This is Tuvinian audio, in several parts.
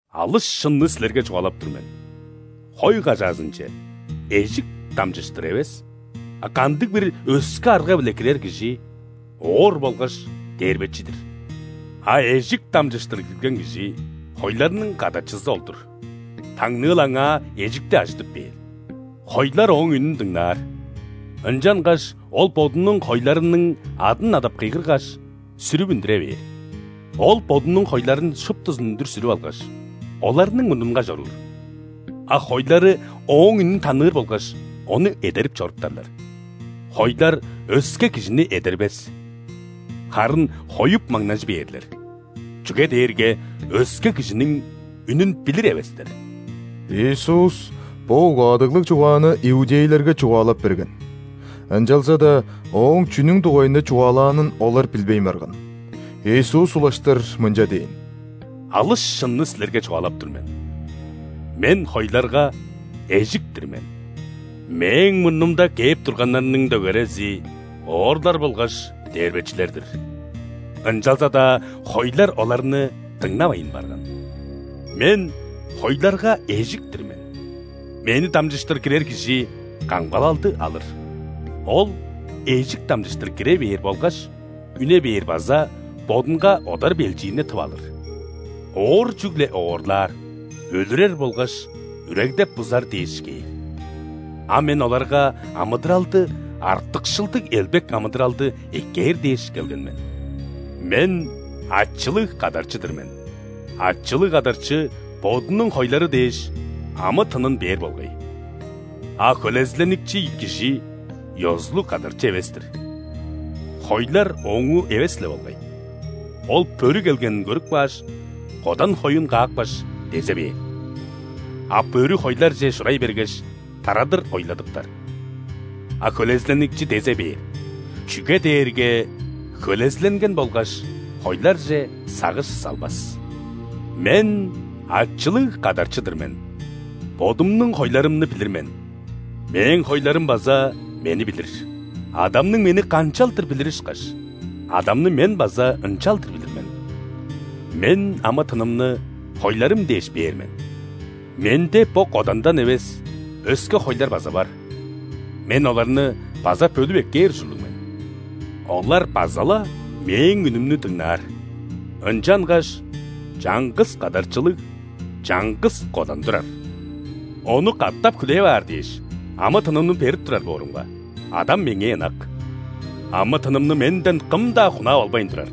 «Алыс шынны силерге чугаалап тур мен: хой кажаазынче эжик дамчыштыр эвес, а кандыг-бир өске арга-биле кирер кижи – оор болгаш дээрбечи-дир. А эжик дамчыштыр кирген кижи – хойларның кадарчызы ол-дур. Таңныыл аңаа эжикти ажыдып бээр. Хойлар ооң үнүн дыңнаар, ынчангаш ол бодунуң хойларының адын адап кыйгыргаш, сүрүп үндүре бээр. Ол бодунуң хойларын шуптузун үндүр сүрүп алгаш, оларның мурнунга чоруур, а хойлары ооң үнүн таныыр болгаш, ону эдерип чоруптарлар. Хойлар өске кижини эдербес, харын хоюп маңнажы бээрлер, чүге дээрге өске кижиниң үнүн билир эвестер». Иисус бо угаадыглыг чугааны иудейлерге чугаалап берген, ынчалза-даа Ооң чүнүң дугайында чугаалаанын олар билбейн барган. Иисус улаштыр мынча дээн: «Алыс шынны силерге чугаалап тур мен: Мен – хойларга эжик-тир мен. Мээң мурнумда кээп турганнарның дөгерези – оорлар болгаш дээрбечилер-дир. Ынчалза-даа хойлар оларны дыңнавайн барган. Мен – хойларга эжик-тир мен. Мени дамчыштыр кирер кижи камгалалды алыр. Ол эжик дамчыштыр кире бээр болгаш үне бээр база бодунга одар-белчиирни тып алыр. Оор чүгле оорлаар, өлүрер болгаш үрегдеп-бузар дээш кээр. А Мен оларга амыдыралды – артыкшылдыг элбек амыдыралды эккээр дээш келген мен. Мен – ачылыг кадарчы-дыр мен: ачылыг кадарчы бодунуң хойлары дээш, амы-тынын бээр болгай. А хөлезиленикчи кижи ёзулуг кадарчы эвес-тир, хойлар ооңуу эвес-ле болгай, ол бөрү келгенин көрүп кааш, кодан хоюн каапкаш, дезе бээр. А бөрү хойларже шурай бергеш, тарадыр ойладыптар. А хөлезиленикчи дезе бээр, чүге дээрге хөлезиленген болгаш, хойларже сагыш салбас. Мен – ачылыг кадарчы-дыр мен, Бодумнуң хойларымны билир мен, Мээң хойларым база Мени билир. Адамның Мени канчалдыр билири ышкаш, Адамны Мен база ынчалдыр билир мен. Мен амы-тынымны хойларым дээш бээр мен. Менде бо кодандан эвес, өске хойлар база бар – Мен оларны база бөлүп эккээр ужурлуг мен. Олар база-ла Мээң үнүмнү дыңнаар, ынчангаш чаңгыс кадарчылыг чаңгыс кодан турар! Ону катап хүлээп аар дээш, амы-тынымны берип турар боорумга, Адам Меңээ ынак. Амы-тынымны Менден кым-даа хунаап албайн турар,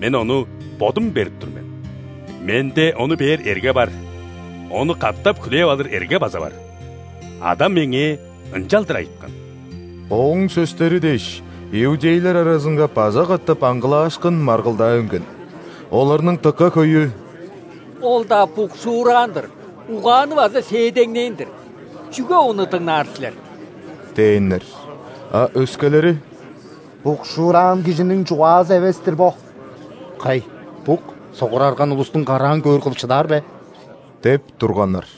Мен ону Бодум берип тур мен. Менде ону бээр эрге бар, ону катап хүлээп алыр эрге база бар. Адам Меңээ ынчалдыр айыткан». Ооң сөстери дээш, иудейлер аразынга база катап аңгылаашкын, маргылдаа үнген. Оларның дыка хөйү: «Ол-даа букшуураан-дыр, угааны база сээдеңнээн-дир. Чүге Ону дыңнаар силер?» – дээннер. А өскелери: «Букшуураан кижиниң чугаазы эвес-тир бо. Кай, бук согурарган улустуң караан көөр кылып шыдаар бе?!» – деп турганнар.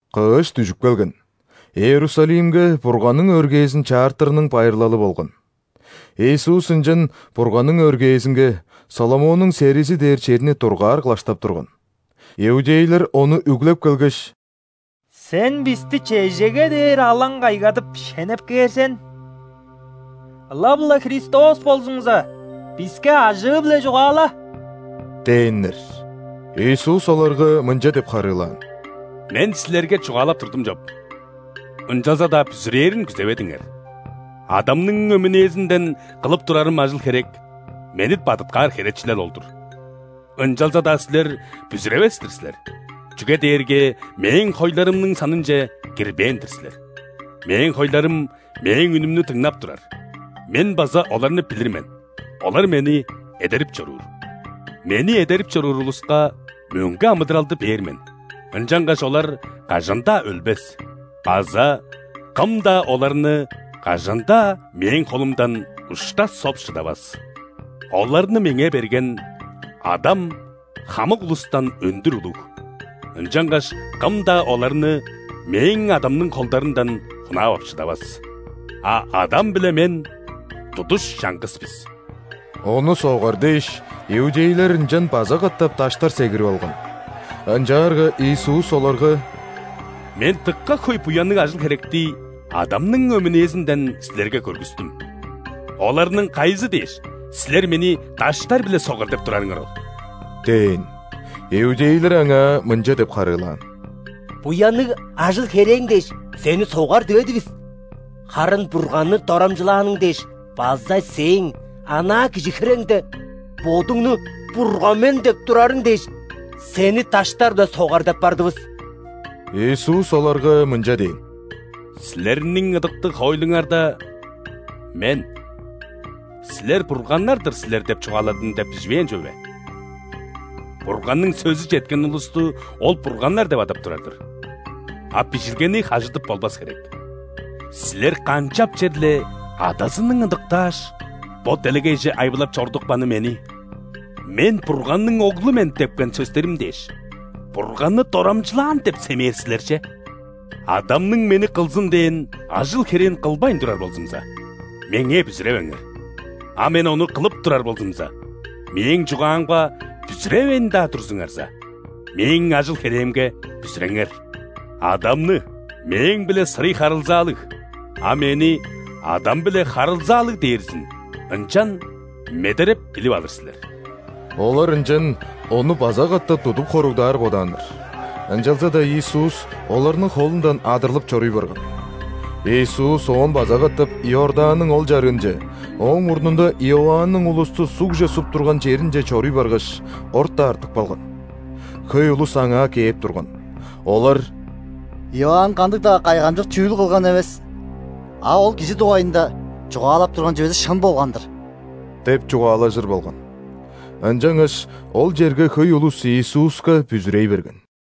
Кыш дүжүп келген. Иерусалимге Бурганның өргээзин чаартырының байырлалы болган. Иисус ынчан Бурганның өргээзинге, Соломоннуң серизи дээр черни дургаар кылаштап турган. Иудейлер Ону үглеп келгеш: «Сен бисти чежеге дээр алаң кайгадып, шенеп кээр сен? Ылап-ла Христос болзуңза, биске ажыы-биле чугаала» – дээннер. Иисус оларга мынча деп харыылаан: «Мен силерге чугаалап турдум чоп, ынчалза-даа бүзүрээрин күзеведиңер. Адамның өмүнээзинден кылып турарым ажыл-херек – Мени бадыткаар херечилел ол-дур. Ынчалза-даа силер бүзүревес-тир силер, чүге дээрге Мээң хойларымның санынче кирбээн-дир силер. Мээң хойларым Мээң үнүмнү дыңнап турар. Мен база оларны билир мен, олар Мени эдерип чоруур. Мени эдерип чоруур улуска мөңге амыдыралды бээр мен, ынчангаш олар кажан-даа өлбес база кым-даа оларны кажан-даа Мээң холумдан ушта соп шыдавас. Оларны Меңээ берген Адам хамык улустан өндүр улуг, ынчангаш кым-даа оларны Мээң Адамның холдарындан хунаап ап шыдавас. А Адам биле Мен – тудуш чаңгыс бис». Ону согар дээш, иудейлер ынчан база катап даштар сегирип алган. Ынчаарга Иисус оларга: «Мен дыка хөй буянныг ажыл-херекти Адамның өмүнээзинден силерге көргүстүм. Оларның кайызы дээш, силер Мени даштар-биле согар деп турарыңар ол?» – дээн. Иудейлер Аңаа мынча деп харыылаан: «Буянныг ажыл-херээң дээш, Сени согар диведивис. Харын Бурганны дорамчылааның дээш база Сээң, анаа кижи хиреңде, Бодуңну Бурган мен деп турарың дээш, Сени даштар-биле согар деп бардывыс». Иисус оларга мынча дээн: «Силерниң ыдыктыг хоойлуңарда: „Мен: ‘Силер бурганнар-дыр силер’ – деп чугааладым“ – деп биживээн чүве бе? Бурганның сөзү четкен улусту Ол бурганнар деп адап турар-дыр. А Бижилгени хажыдып болбас херек. Силер канчап черле Адазының ыдыктааш, бо делегейже айбылап чорудупканы Мени: „Мен – Бурганның Оглу мен“ – депкен сөстерим дээш, „Бурганны дорамчылаан“ деп семээр силер че? Адамның Мени кылзын дээн ажыл-херээн кылбайн турар болзумза, Меңээ бүзүревеңер! А Мен ону кылып турар болзумза, Мээң чугаамга бүзүревейн-даа турзуңарза, Мээң ажыл-херээмге бүзүреңер! Адамны – Мээң-биле сырый харылзаалыг, а Мени – Адам-биле харылзаалыг дээрзин ынчан медереп билип алыр силер». Олар ынчан Ону база катап тудуп хоругдаар бодааннар. Ынчалза-даа Иисус оларның холундан адырлып чоруй барган. Иисус оон база катап Иорданның ол чарыынче, ооң мурнунда Иоанның улусту ·сугже суп турган черинче чоруй баргаш, орта артып калган. Хөй улус Аңаа кээп турган. Олар: «Иоанн кандыг-даа кайгамчык чүүл кылган эвес. А ол Кижи дугайында чугаалап турган чүвези шын болган-дыр» – деп чугаалажыр болган. Ынчангаш ол черге хөй улус Иисуска бүзүрей берген.